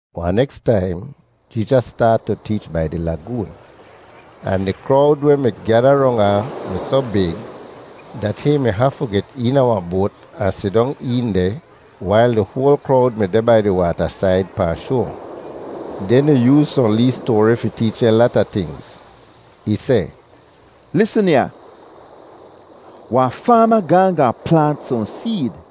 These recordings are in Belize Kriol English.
Wahn neks taim Jeezas staat tu teech bai di lagoon, ahn di krowd weh mi gyada rong ahn mi soh big dat hihn mi hafu get eena wahn boat ahn sidong een deh wail di hoal krowd mi deh bai di waatasaid pahn shoa. Den ih yooz sohn lee stoari fi teech dehn lata tingz. Ih seh, “Lisn ya, wahn faama gaahn gaahn plaant sohn seed.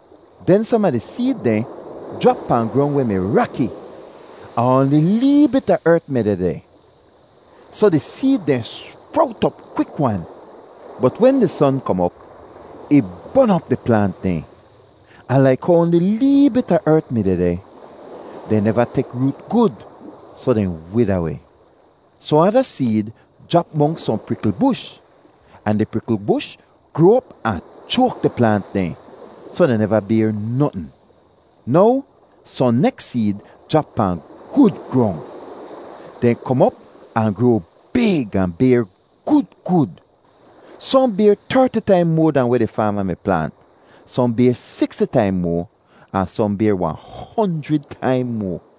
Den som a di seed dehn jrap pahn grong weh mi raki, ahn oanli lee bit a ert mi dehdeh, soh di seed dehn sprowt op kwik-wan. Bot wen di son kom op, ih bon op di plaant dehn, ahn laik how oanli lee bit a ert mi dehdeh, dehn neva tek root gud, soh dehn wida weh. Sohn ada seed jrap monks sohn prikl bush, ahn di prikl bush groa op ahn choak di plaant dehn, soh dehn neva bayr notn. Now sohn neks seed jrap pahn gud grong. Dehn kom op ahn groa big ahn bayr gud gud. Sohn bayr terti taim moa dahn weh di faama mi plaant, sohn bayr siksti taim moa, ahn sohn bayr wahn honjrid taim moa.”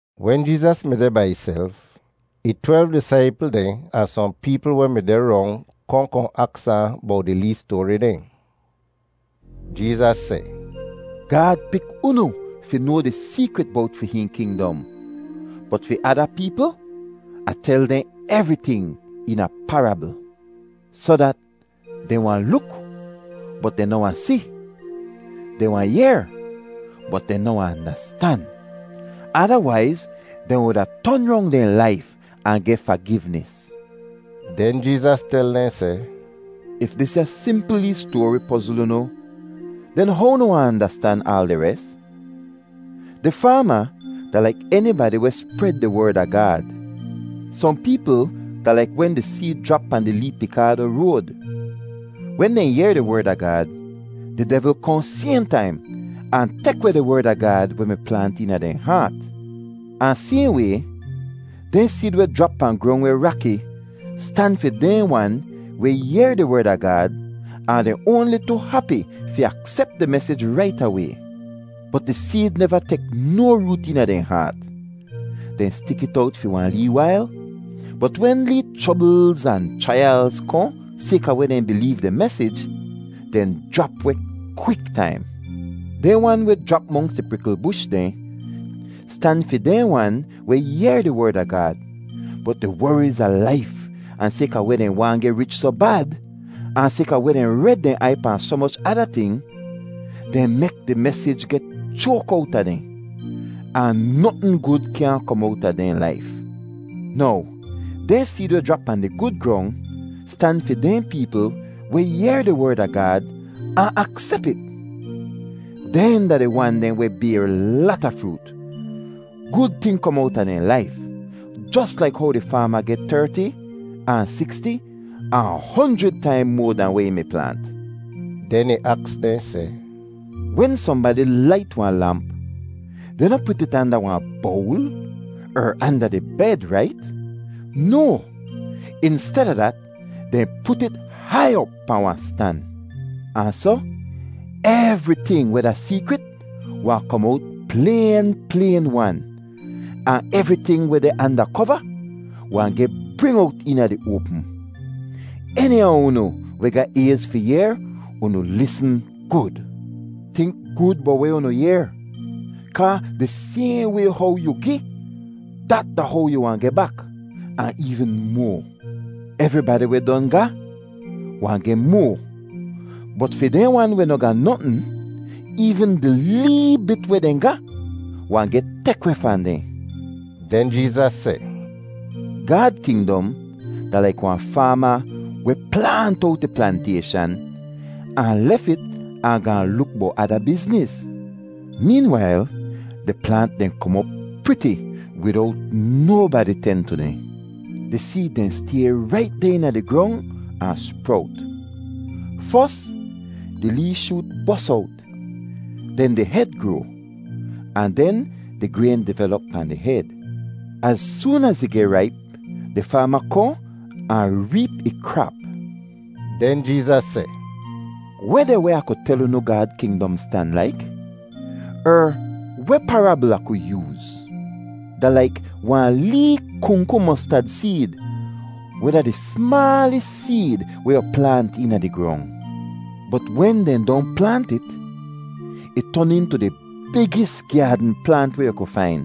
Wen Jeezas mi deh bai ihself, ih twelv disaipl dehn ahn sohn peepl weh mi deh rong kohn kohn aks ahn bowt di lee stoari dehn. Jeezas seh, “Gaad pik unu fi noa di seekrit bowt fi hihn kingdom, bot fi ada peepl Ah tel dehn evriting eena parabl soh dat, ‘Dehn wahn luk, bot dehn noh wahn si. Dehn wahn yehr, bot dehn noh wahn andastan. Adawaiz dehn wuda ton rong dehn laif ahn geh fagivnis.’” Den Jeezas tel dehn seh, “If disya simpl lee stoari pozl unu, den how unu wahn andastan aal di res? Di faama da laik enibadi weh spred di Werd a Gaad. Sohn peepl da laik wen di seed jrap pahn di lee pikaado road; wen dehn yehr di Werd a Gaad, di devl kohn sayhn taim ahn tek weh di Werd a Gaad weh mi plaant eena dehn haat. Ahn sayhn way dehn seed weh jrap pahn grong weh raki stan fi dehn wan weh yehr di Werd a Gaad ahn dehn oanli tu hapi fi aksep di mesij rait away, bot di seed neva tek no root eena dehn haat. Dehn stik it owt fi wahn lee wail, bot wen lee chroblz ahn chraiyalz kohn sayka weh dehn bileev di mesij, dehn jrap weh kwik-taim. Dehn wan weh jrap monks di prikl bush dehn stan fi dehn wan weh yehr di Werd a Gaad, bot di woriz a laif ahn sayka weh dehn waahn geh rich soh bad, ahn sayka weh dehn red dehn aiy pahn soh moch ada ting, dehn mek di mesij geh choak owta dehn, ahn notn gud kyaahn kom owta dehn laif. Now dehn seed weh jrap pahn di gud grong stan fi dehn peepl weh yehr di Werd a Gaad ahn aksep it. Dehn da di wan dehn weh bayr lata froot—gud ting kom owta dehn laif, jos laik how di faama geh terti, ahn siksti, ahn honjrid taim moa dahn weh ih mi plaant.” Den ih aks dehn seh, “Wen sohnbadi lait wahn lamp, dehn noh put it anda wahn bowl er anda di bed, rait? No. Insteda dat, dehn put it hai op pahn wahn stan. Ahn soh evriting weh da seekrit wahn kom owt playn playn-wan, ahn evriting weh deh anda kova wahn geh bring owt eena di oapm. Eni a unu weh ga ayz fi yehr, unu lisn gud! “Tink gud bowt weh unu yehr. Kaa di sayhn way how yu gi, dat da how yu wahn geh bak, ahn eevn moa. Evribadi weh don ga wahn geh moa, bot fi dehn wan weh noh ga notn, eevn di lee bit weh dehn ga wahn geh tek weh fahn dehn.” Den Jeezas seh, “Gaad kingdom da laik wahn faama weh plaant owt ih plantayshan ahn lef it ahn gaahn luk bowt ada bizniz. Meenwail di plaant dehn kom op priti widowt nobadi ten tu dehn. Di seed dehn stay rait deh eena di grong ahn sprowt. Fos, di lee shoot bos owt, den di hed groa, ahn den di grayn divelop pahn di hed. Az soon az ih geh raip, di faama kohn ahn reep ih krap.” Den Jeezas seh, “Weh deh weh Ah ku tel unu Gaad kingdom stan laik? Er weh parabl Ah ku yooz? Da laik wahn lee kungku mostad seed weh da di smaalis seed weh yu plaant eena di grong. Bot wen dehn don plaant it, ih ton intu di bigis gyaadn plaant weh yu ku fain,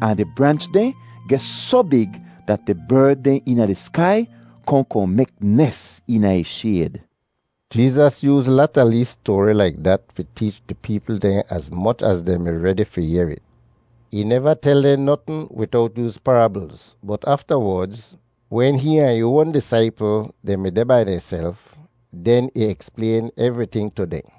ahn di branch dehn geh soh big dat di berd dehn eena di skai kohn kohn mek nes eena ih shayd.” Jeezas yooz lata lee stoari laik dat fi teech di peepl dehn az moch az dehn mi redi fi yehr it. Ih neva tel dehn notn widowt yooz parablz, bot aftawodz, wen hihn ahn ih oan disaipl dehn mi deh bai dehnself, den ih eksplayn evriting tu dehn.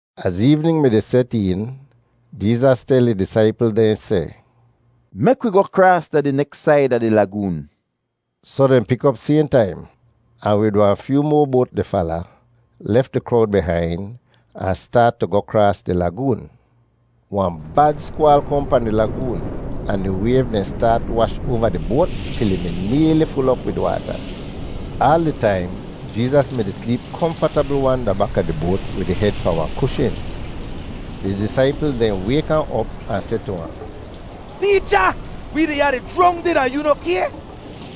Az eevnin mi-di set een, Jeezas tel ih disaipl dehn seh, “Mek wi goh kraas da di neks said a di lagoon.” Soh dehn pik op sayhn taim, ahn wid wahn fyoo moa boat di fala, lef di krowd bihain, ahn staat tu goh kraas di lagoon. Wahn bad skwaal kohn pahn di lagoon ahn di wayv dehn staat wash oava di boat til ih mi nayli ful op wid waata. Aal di taim Jeezas mi-di sleep komfatabl-wan da baka di boat wid ih hed pahn wahn kushn. Di disaipl dehn wayk ahn op ahn seh tu ahn, “Teecha, wi deh ya di jrongdid, ahn yoo noh kay?”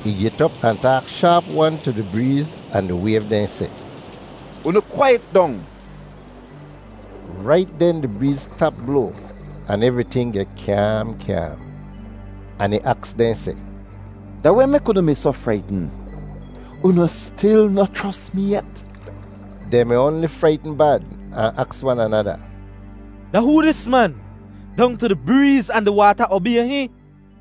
Ih get op ahn taak shaap-wan tu di breez ahn di wayv dehn seh, “Unu kwaiyet dong!” Rait den di breez stap bloa ahn evriting geh kyaam kyaam. Ahn ih aks dehn seh, “Da weh mek unu mi soh fraitn? Unu stil noh chros mi yet?” Dehn mi oanli fraitn bad ahn aks wan anada, “Da hoo dis man? Dong tu di breez ahn di waata obay hihn!”